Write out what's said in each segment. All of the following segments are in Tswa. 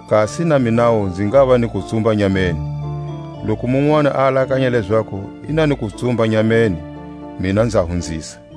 Kasi na minawu nzi ngava ni kutsumba nyameni. Loku munwani a alakanya lezaku i na ni kutsumba nyameni, mina nza hunzisa.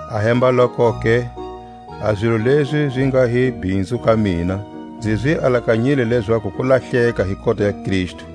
Ahembalokoke, a zilo lezi zi nga hi bhinzu ka mina, nzi zi alakanyile lezaku kulahleka hi kota ya Kristu.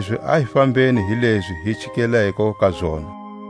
Kanilezi a hi fambeni hi lezi hi chikeleko ka zona.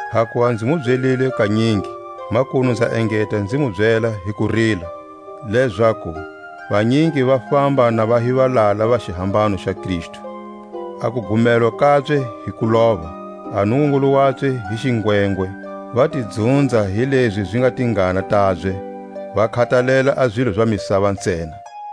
Hakuva nzi mu byelile kanyingi, makunu nza engeta nzi mu byela hi kurila, lezaku vanyingi va famba na va hi valala va xihambano xa Kristu. A kugumelwa kabye hi kulova; a nungungulu wabye hi xingwengwe, va ti dzunza hi lezi zi nga tingana tabye, va khatalela a zilo za misava ntsena.